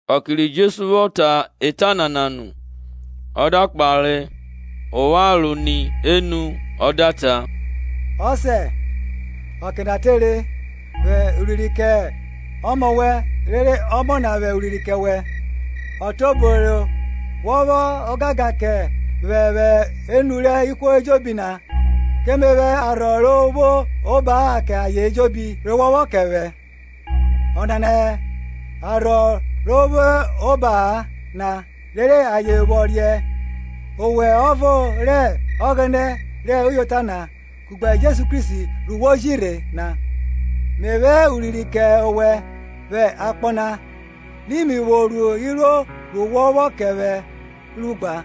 Ọke ri Jesu vwọ ta eta nana nu, ọ da kpare opharo ni enu ọ da ta, Ọsẹ, ọke na tere; vwẹ urinrin kẹ Ọmọ wẹn rere Ọmọ na vwẹ urinrin kẹ owẹ. Ọtiobo re wọ vwẹ ogangan kẹ vwẹ vwẹ enu rẹ ihwo ejobi na, ke me vwẹ arhọ ro vwo oba-a kẹ ayen ejobi re wọ vwọ kẹ vwẹ. Ọnana hẹ arhọ ro vwo oba-a na, rere ayen vwọ riẹn owẹ ọvo rẹ Ọghẹnẹ rẹ uyota na, kugbe Jesu Kristi ru wo ji rhe na. Me vwẹ urinrin kẹ owẹ vwẹ akpọ na, ri mi vwo ru iruo ru wọ vwọ kẹ vwẹ ru gba;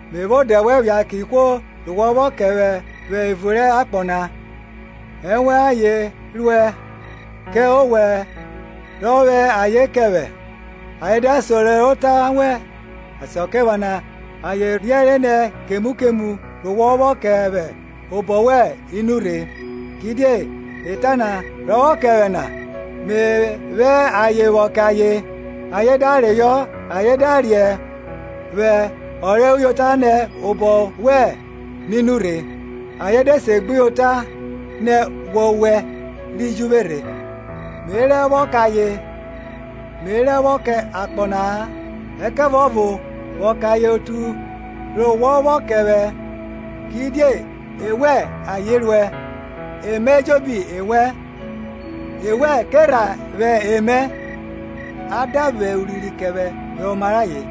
Me vwẹ odẹ wẹn phia kẹ ihwo re wọ kẹ vwẹ vwẹ evun rẹ akpọ na; ewẹn ayen ruẹ, kẹ owẹ re vwẹ ayen kẹ vwẹ, ayen da sẹro rẹ ota wẹn. Asakiephana ayen riẹnre nẹ kemu kemu ru wọ vwọ kẹ vwẹ obọ wẹn i nurhe; kidie eta na re wọ vwọ kẹ vwẹ na me vwẹ ayen vwọ kẹ ayen, ayen da reyọ ayen da riẹn vwẹ ọ rẹ uyota nẹ obọ wẹn mi nurhe; ayen de segbuyota nẹ wọwẹ ri ji vwe rhe. Me rẹ vwọ kẹ ayen; me rẹ vwọ kẹ akpọ na-a ẹkẹvuọvo vwọ kẹ ayen otu re wọ vwọ kẹ vwẹ, kidie ewẹn ayen ruẹ. E rẹ mi vwori ejobi na ewẹn, ewẹn ke rha vwẹ emẹ, a da vwẹ urinrin kẹ vwẹ vwẹ oma rẹ ayen.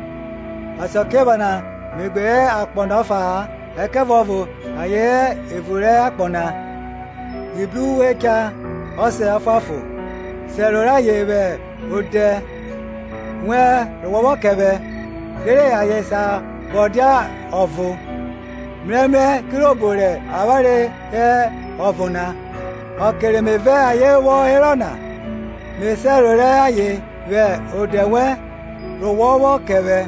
Asakiephana me gbe hẹ akpọ na ọfa-a, ẹkẹvuọvo ayen hẹ evun rẹ akpọ na, mi bru uwe cha. Ọsẹ Ọfuanfon, sẹro rayen vwẹ odẹ wẹn ru wọ vwọ kẹ ovwẹ, rere ayen sa vwọ dia ọvo, mrẹmrẹ kirobo rẹ avwanre hẹ ọvo na. Ọke re me vẹ ayen vwọ hẹro na, me sẹro rẹ ayen vwẹ odẹ wẹn re wọ vwọ kẹ vwẹ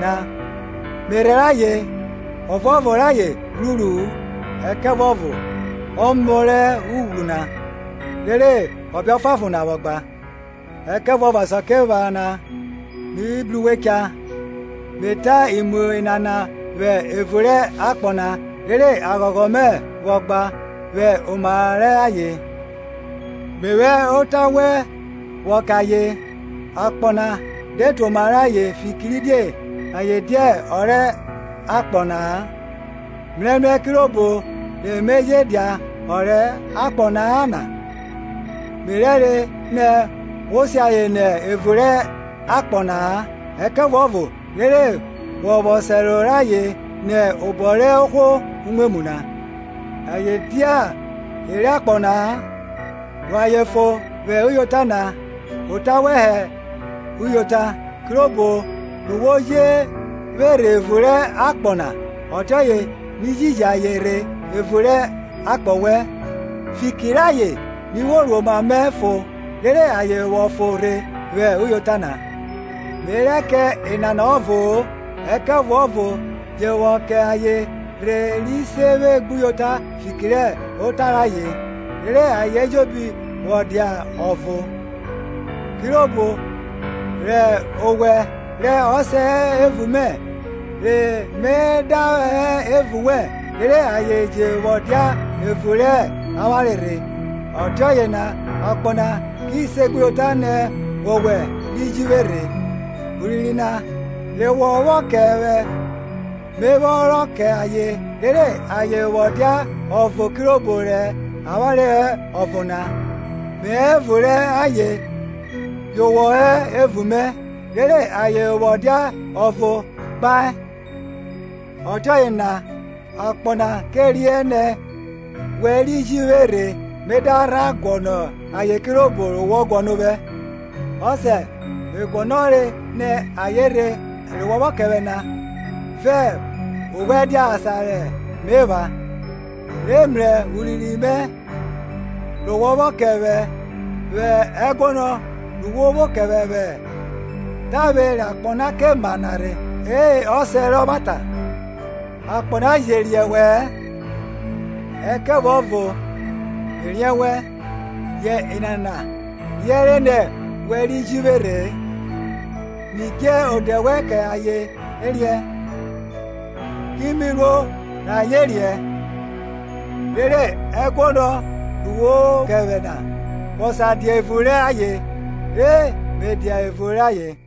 na; me rhẹrẹ ayen, ọvuọvo rẹ ayen ghwruru-u ẹkẹvuọvo ọmọ rẹ ughwru na, rere ọbe ọfuanfon na vwọ gba. Ẹkẹvuọvo asakiephana mi bru uwe cha; me ta imu nana vwẹ evun rẹ akpọ na, rere aghọghọ mẹ vwọ gba vwẹ oma rẹ ayen. Me vwẹ ota wẹn vwọ kẹ ayen; akpọ na de tuoma rẹ ayen fikiridie ayen dia e rẹ akpọ na-a, mrẹmrẹ kirobo re me je dia ọ rẹ akpọ na-a na. Me rẹ re nẹ wo si ayen nẹ evun rẹ akpọ na-a, ẹkẹvuọvo rere wọ vwọ sẹro rẹ ayen nẹ obọ rẹ ohwo umwemwu na. Ayen dia e rẹ akpọ na-a. Ru ayen fon vwẹ uyota na; ota wẹn hẹ uyota. Kirobo ru wo ji vwe rhe evun rẹ akpọ na, ọtiọye mi ji ji ayen rhe evun rẹ akpọ wẹn. Fiki rayen mi vwo ru oma mẹ fọn, rere ayen vwọ fọn rhe vwẹ uyota na. Me rẹ kẹ enana ọvo-o, ẹkẹvuọvo je vwọ kẹ ayen rhe ri se vwe gbuyota fiki rẹ ota rayen, rere ayen ejobi vwọ dia ọvo; kirobo rẹ owẹ, rẹ Ọsẹ, hẹ evun mẹ, re me da hẹ evun wẹ, rere ayen je vwọ dia evun rẹ avwanre rhe, ọtiọye na akpọ na ki segbuyota nẹ wọwẹ ri ji vwe rhe. Urinrin na re wọ vwọ kẹ vwẹ me vwe rọ kẹ ayen, rere ayen vwọ dia ọvo kirobo rẹ avwanre hẹ ọvo na. Me hẹ evun rẹ ayen yu wọ hẹ evun mẹ, rere ayen vwọ dia ọvo gbae, ọtiọye na akpọ na kẹ riẹn nẹ we ri ji vwẹ rhe me da rha guọnọ ayen kirobo ru wọ guọnọ ovwẹ. Ọsẹ, me guọnọre nẹ ayen rhe, re wọ vwọ kẹ vwẹ na, vẹ ovwẹ dia asan re me epha, re mrẹ urinrin mẹ re wọ kẹ vwẹ vwẹ ẹguọnọ ru wọ vwọ kẹ vwẹ tavwe ra ke ma akpọ na. E Ọsẹ rẹ ọvwata, akpọ na je riẹn wẹ-ẹn, ẹkẹvuọvo me riẹn wẹn; yẹ enana riẹnre nẹ wẹ ri ju vwe rhe. Mi dje odẹ wẹn kẹ ayen, ki mi ruo re ayen vwọ riẹn, rere ẹguọnọ ru wọ vwọ kẹ vwẹ na vwọ sa dia evun rẹ ayen, re me dia evun rẹ ayen.